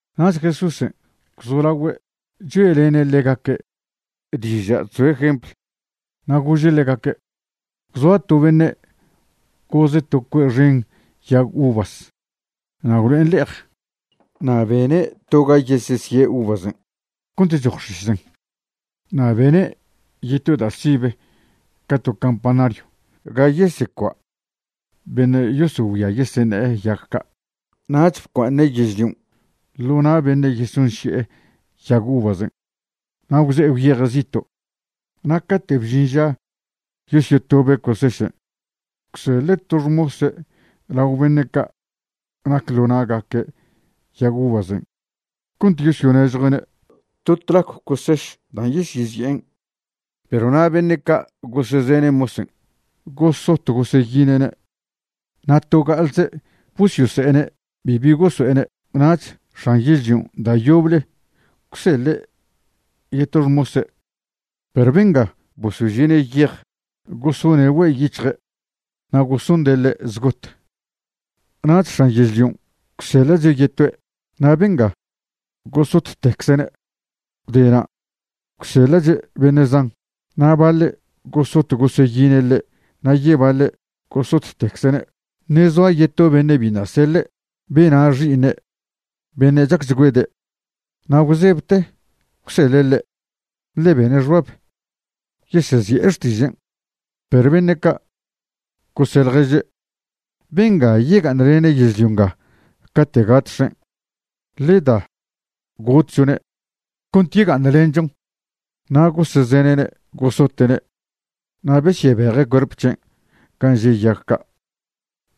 Nach Jesúsen' gwzolagüe' choe'lene' ḻegaque' diža' chzoe' jempl, na' gože' ḻegaque': ―Gwzoa to beṉe' goze' to cue' xen yag uvas na' gwlo'en le'ej. Na' bene' to ga yesesie' uvasen' cont choj x̱isen', na' bene' yeto da' sibe ca to campanario ga yesecua' beṉe' yosogüia yeseṉe'e yag ca'. ’Nach bcua'aṉe' yežlion' ḻo na' beṉe' yesonši'e yag uvasen', na' gwze'e gwyeje' zito'. Na' cate' bžin ža yosyotobe' cosešen', gwseḻe' to xmose' lao beṉe' ca' nac ḻo na'gaque' yag uvasen' cont yosonežjue'ne' to tlacw coseš dan' yesyezi'en. Perw na' beṉe' ca gosezene' mosen' gosot goseyine'ne', na' to ga'alze' bosyose'ene' bibi goso'ene'. Nach x̱an yežlion' da' yoble gwseḻe' yeto xmose'; perw benga bosožie'ne' yej, gosone' güe' yic̱hje' na' gosonde' ḻe' zgot. Nach x̱an yežlion' gwseḻa'che' yetoe', na' benga gosottecze'ne'. Gwdena' gwseḻa'che' beṉe' zan, na' baḻe' gosot goseyine' ḻe' na' yebaḻe' gosottecze'ne'. ’Ṉe' zoa yeto beṉe' biṉa' seḻe', bena' xi'iṉe' beṉe' chacchgüede', na' bzebte gwseḻe' ḻe', ḻe bene' xbab: “Yesezi'e xtižen'.” Perw beṉe' ca' gose' ḻježe': “Bengan' yega'aṉlene' yežlio nga cate' gat x̱en'. Ḻe da gotchone' cont yega'aṉlenchon.” Na' gosezene'ne', gosote'ne', na' besyebeje' cuerp c̱hen' gan' že' yag ca',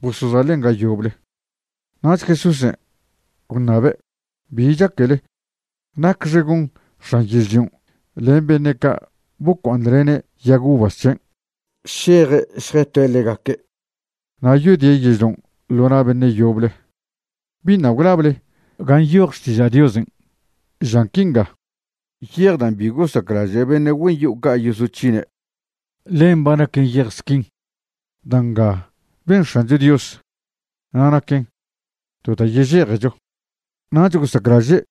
bosozaḻen' ga yoble. Nach Jesúsen' gwṉabe': ―¿Bi chaquele? ¿Nacxe gon x̱an yežlion' len beṉe' ca' bocua'aṉlene' yag uvas c̱hen'? Šeje' šjetoe' ḻegaque', na' yodie' yežlion' ḻo na' beṉe' yoble. ’¿Biṉa' gwlable ga nyoj Xtiža' Diosen'? žan quinga: Yej dan' bi gosaclaže' beṉe' güen yo'o ca' yosoc̱hine', ḻen ba naquen yej squin. Da' nga ben X̱ancho Dios, na' naquen to da' yežejecho. Nach gosaclaže'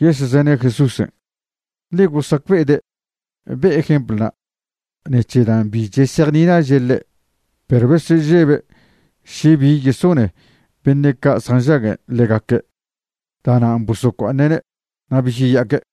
yesezene' Jesúsen', ḻe gosacbe'ede' be'e jemplna' ṉec̱he dan' bi chesejnilaže' ḻe'. Perw besežebe' še bi yesone beṉe' ca' nžaguen' ḻegaque', da'nan' bosocua'aṉe'ne' na' besyeya'aque'.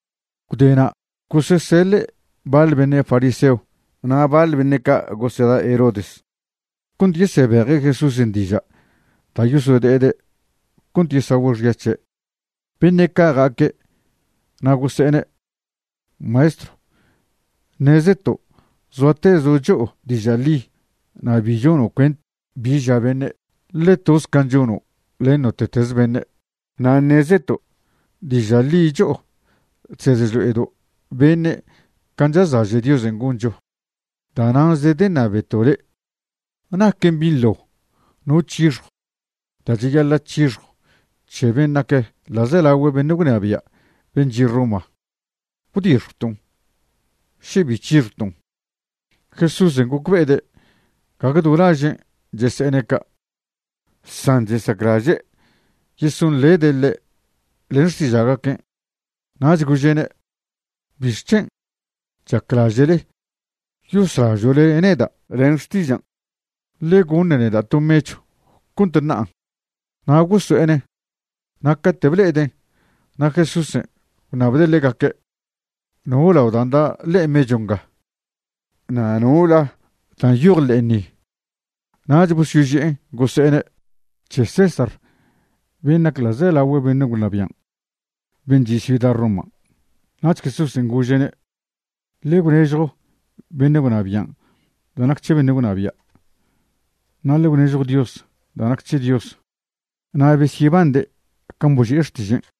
Gwdena' goseseḻe' baḻ beṉe' fariseo na' baḻ beṉe' ca' goseda' Herodes cont yesebeje' Jesúsen' diža' da' yosode'ede' cont yesagüe' xya c̱he'. Beṉe' ca' ja'aque' na' gose'ene': ―Maestro, ṉezeto' zoatezo' cho'o diža' ḻi na' bi chono' cuent bi ža beṉe', ḻe toze can' chono' len note'teze beṉe'. Na' ṉezeto' diža' ḻi cho'o chsed chlo'edo' beṉe' can' chazlaže' Diosen' goncho. Da'nan' zedeṉabeto' le' ¿naquen binḻo no c̱hixjo da' cheyaḻa' c̱hixjo c̱he ben' nac ḻa'zelagüe beṉe' gwnabia' ben' chi' Roma? ¿Gwdixjwton', še bi c̱hixjwton'? Jesúsen' gocbe'ede' gague do lažen' chese'ene' ca', san chesaclaže' yesonḻede' ḻe' len xtiža'gaquen', nach gože'ne': ―¿Bixc̱hen' chaclaže'le yoslažo'le neda' len xtižan'? Ḻe goṉ neda' to mechw cont ṉa'an. Na' goso'enen', na' cate' ble'eden' na' Jesúsen' gwṉabde' ḻegaque': ―¿No lao dan' da' ḻe'e mechw nga? na' ¿no la dan' nyoj ḻe'en ni? Nach bosoyoži'en gose'ene': ―C̱he César ben' nac ḻa'zelagüe beṉe' gwnabian' ben' chi' ciuda Roman'. Nach Jesúsen' gože'ne': ―Ḻe gwnežjo beṉe' gwnabian' da' nac c̱he beṉe' gwnabia', na' ḻe gwnežjo Dios da' nac c̱he Dios. Na' besyebande' can' boži'e xtižen'.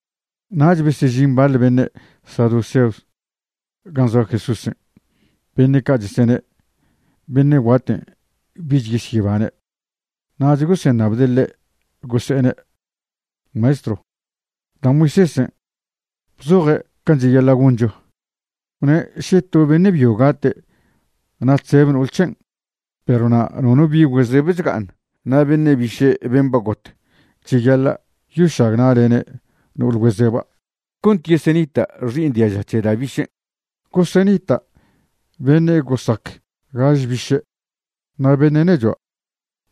Nach besežin baḻ beṉe' saduceos gan' zoa Jesúsen'. Beṉe' ca' chesene' beṉe' guaten' bich yesyebane'. Nach goseṉabde' ḻe', gose'ene': ―Maestro, da' Moisésen' bzoje' can' cheyaḻa' goncho, gwne' še to beṉe' byo gate' na' chzeb no'ol c̱hen' perw na' nono bi' güezeb chga'aṉ, na' beṉe' biše' ben' ba got cheyaḻa' yošagna'lene' no'ol güezeba' cont yesenita' xi'iṉ diaža c̱he da' bišen'. Gosenita' beṉe' gosac gaž biše'. Na' beṉe' nechua'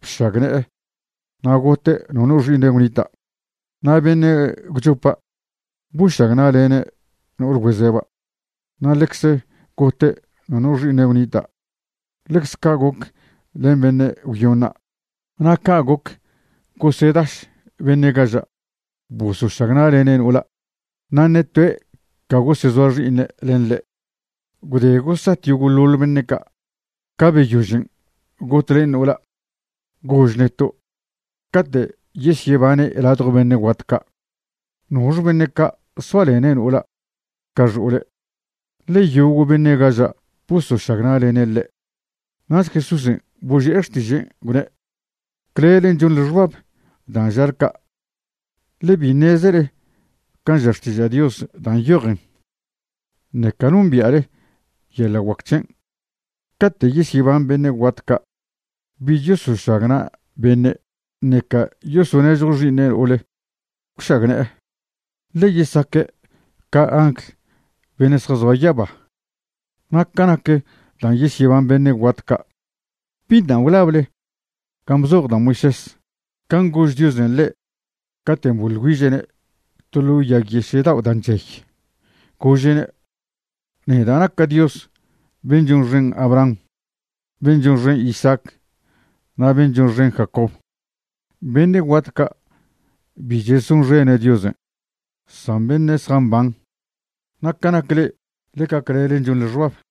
bšagne'e, na' gote' nono xi'iṉe' gwnita'. Na' beṉe' gwchopa' bošagna'lene' no'ol güezeba', na' ḻecze gote' nono xi'iṉe' gwnita'. Ḻecze ca' goc len beṉe' gwyoṉa'. Na' ca' goc gosedaš beṉe' gaža' bosošagna'lene' no'ola', na' ṉe toe' ca gosezoa xi'iṉe' len ḻe'. Gwde gosat yogo'ḻoḻ beṉe' ca', ca beyožen got len no'ola'. Gož neto', cate' yesyebane' ladjo beṉe' guat ca' ¿nox beṉe' ca' soalene' no'ola' ca xo'ole'? ḻe yogo' beṉe' gaža' bosošagna'lene' ḻe'. Nach Jesúsen' boži'e xtižen', gwne': ―Clelen' chonḻe xbab dan' žale ca', ḻe bi ṉezele can' ža Xtiža' Dios da' nyojen, ṉeca nombia'le yeḻa' guac c̱hen'. Cate' yesyeban beṉe' guat ca' bich yosošagna' beṉe', ṉeca yosonežjo xi'iṉe' no'ol gwšagne'e, ḻe yesaque' ca angl beṉe' zjazoa yaba. Na' ca nac dan' yesyeban beṉe' guat ca', ¿biṉa' gwlable gan' bzoj da' Moisés, can' gož Diosen' ḻe' caten' boḻ güiže'ne' to ḻo yag yeše' dao' da' chey? Gože'ne': “Neda' naca' Dios ben' chonxen Abraham, ben' chonxen Isaac, na' ben' chonxen Jacob.” Beṉe' guat ca' bi chesonxene' Diosen', san beṉe' zjamban. Na' ca nac le'e, ḻeca clelen' chonḻe xbab.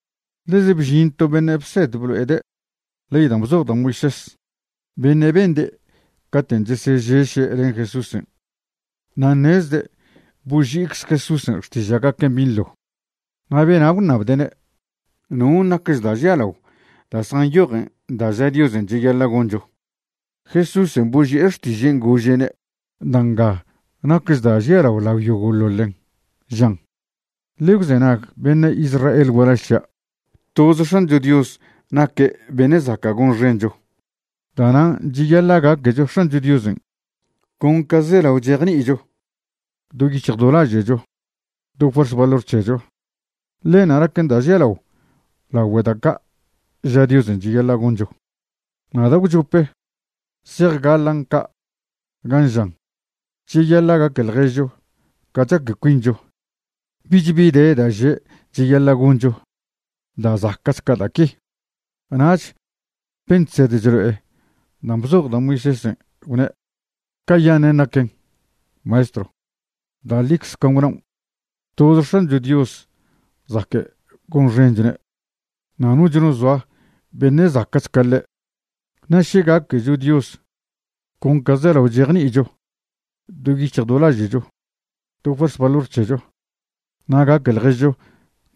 Ḻeze bžin to beṉe' bsed blo'ede' ley dan' bzoj da' Moisés, beṉe' bende' caten' chesežeše' len Jesúsen', na' ṉezde' boži'icze Jesúsen' xtiža'gaquen' binḻo. Na' bena' gwṉabde'ne': ―¿Non' nacch da' žialao da' zjanyojen da' ža Diosen' cheyaḻa' goncho? Jesúsen' boži'e xtižen' gože'ne': ―Da' nga nacch da' žialao lao yogo'ḻoḻen, žan: “Ḻe gwzenag beṉe' Israel gualaž c̱hia', toze X̱ancho Dios naque' beṉe' zaca' gonxencho. Da'nan' cheyaḻa' gaquecho X̱ancho Diosen' con ca zelao chejni'icho, do yic̱hj do laže'cho, do fuerz valor c̱hecho.” Ḻenṉa' naquen da' žialao lagüe da' ca' ža Diosen' cheyaḻa' goncho. Na' da' gwchopen' zejgaḻan' ca', gan' žan': “Cheyaḻa' gaque ḻježcho ca chaque cuincho.” Bich bi de da' že' cheyaḻa' goncho da' zaca'ch ca da' qui. Nach ben' chsed chlo'e dan' bzoj da' Moisésen' gwne': ―Ca'yaṉen' naquen, Maestro. Da' ḻicze can' gwnaon'. Toze X̱ancho Dios zaque' gonxenchone', na' noch no zoa beṉe' zaca'ch ca ḻe'. Na' še gaquecho Dios, con ca zelao chejni'icho, do yic̱hj do laže'cho, do fuerz valor c̱hecho, na' gaque ḻježcho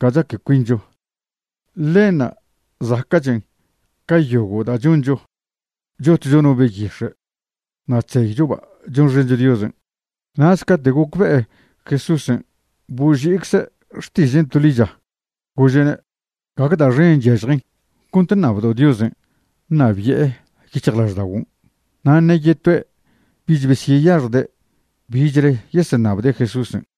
ca chaque cuincho, ḻenṉa' zaca'chen ca yogo' da' choncho chotcho no beyix̱e' na' chzeychoba' chonxencho Diosen'. Nach cate' gocbe'e Jesúsen' boži'icze' xtižen' to ḻicha, gože'ne': ―Gague da' xen chyažjen cont ṉabdo' Diosen' ṉabi'e yic̱hjlažda'oguon'. Na' ṉe yetoe' bich beseyaxjde' bichle yeseṉabde' Jesúsen'.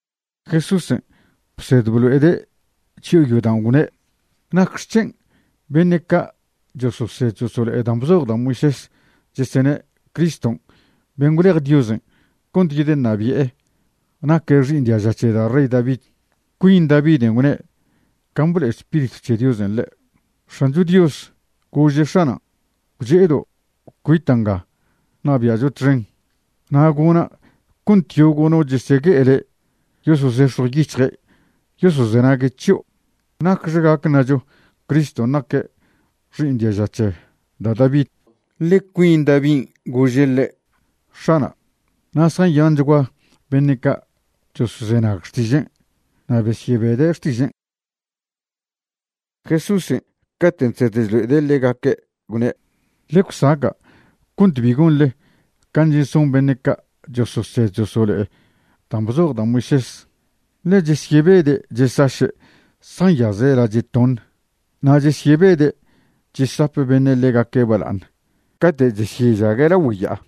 Jesúsen' bsed blo'ede' chyo'o yodaon', gwne': ―¿Nacxec̱hen' beṉe' ca' chososed chosolo'e dan' bzoj da' Moisés chesene' Criston' ben' gwlej Diosen' cont yedeṉabi'e naque xi'iṉ diaža c̱he da' rey David? Cuin Daviden' gwne' can' blo'e Spiritw c̱he Diosen' ḻe': X̱ancho Dios gože' X̱anan': “Gwche'edo' cuita' nga ṉabi'acho txen, na' gona' cont yogo' no chesegue'e le' yosozex̱jw yic̱hje' yosozenague' c̱hio'.” ¿Nacxe gac ṉacho Criston' naque' xi'iṉ diaža c̱he da' David? ḻe cuin Davin' gože' ḻe': “X̱ana'”. Na' zjanyanchgua beṉe' ca' chosozenag xtižen', na' besyebede' xtižen'. Jesúsen' caten' chsed chlo'ede' ḻegaque' gwne': ―Ḻe gwsaca' cont bi gonḻe can' cheson beṉe' ca' chososed chosolo'e dan' bzoj da' Moisés, ḻe chesyebede' chesaše' zjanyaze' lache' toṉ, na' chesyebede' chesap beṉe' ḻegaque' bala'aṉ cate' chesyežague' lagüe ya'a.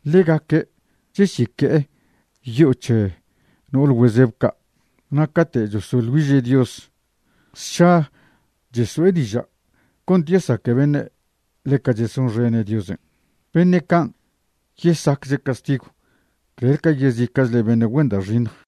Ḻegaque' cheseque'e yo'o c̱he no'ol güezeb ca', na' cate' chosoḻ güiže' Dios, sša cheso'e diža' cont yesaque beṉe' ḻeca chesonxene' Diosen'. Beṉe' can' yesacche' castigw clel ca yezica'chle beṉe' güen da' xiṉj.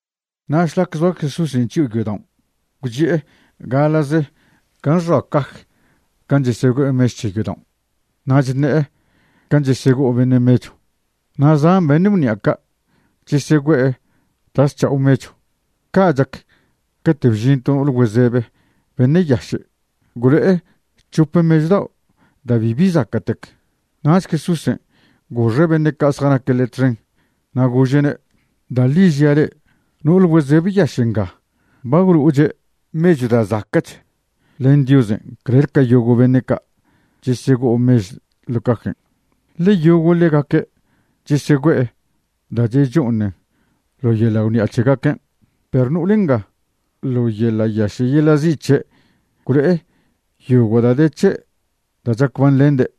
Na' šlac zoa Jesúsen' chyo'o yodaon', gwchi'e gaḻa'ze gan' xoa caj gan' chesegüe'e mechw c̱he yodaon', na' chṉe'e can' chesego'o beṉe' mechw. Na' zan beṉe' gwṉi'a ca' chesegüe'e da' zc̱ha'o mechw. Ca' chac, cate' bžin to no'ol güezebe beṉe' yaše', gwlo'e c̱hop mechw dao' da' bibi zaca'tec. Nach Jesúsen' goxe' beṉe' ca' zjanaque' ḻe' txen na' gože'ne': ―Da' ḻi žia' le'e, no'ol güezebe yaše' nga ba gwlo'oche' mechw da' zaca'ch len Diosen' clel ca yogo' beṉe' ca' chesego'o mechw ḻo' cajen', ḻe yogo' ḻegaque' chesegüe'e da' checho'oṉen ḻo yeḻa' gwṉi'a c̱hegaquen', perw no'ol nga, ḻo yeḻa' yaše' yeḻa' zi' c̱he' gwlo'e yogo' da' de c̱he' da' chacbanḻende'.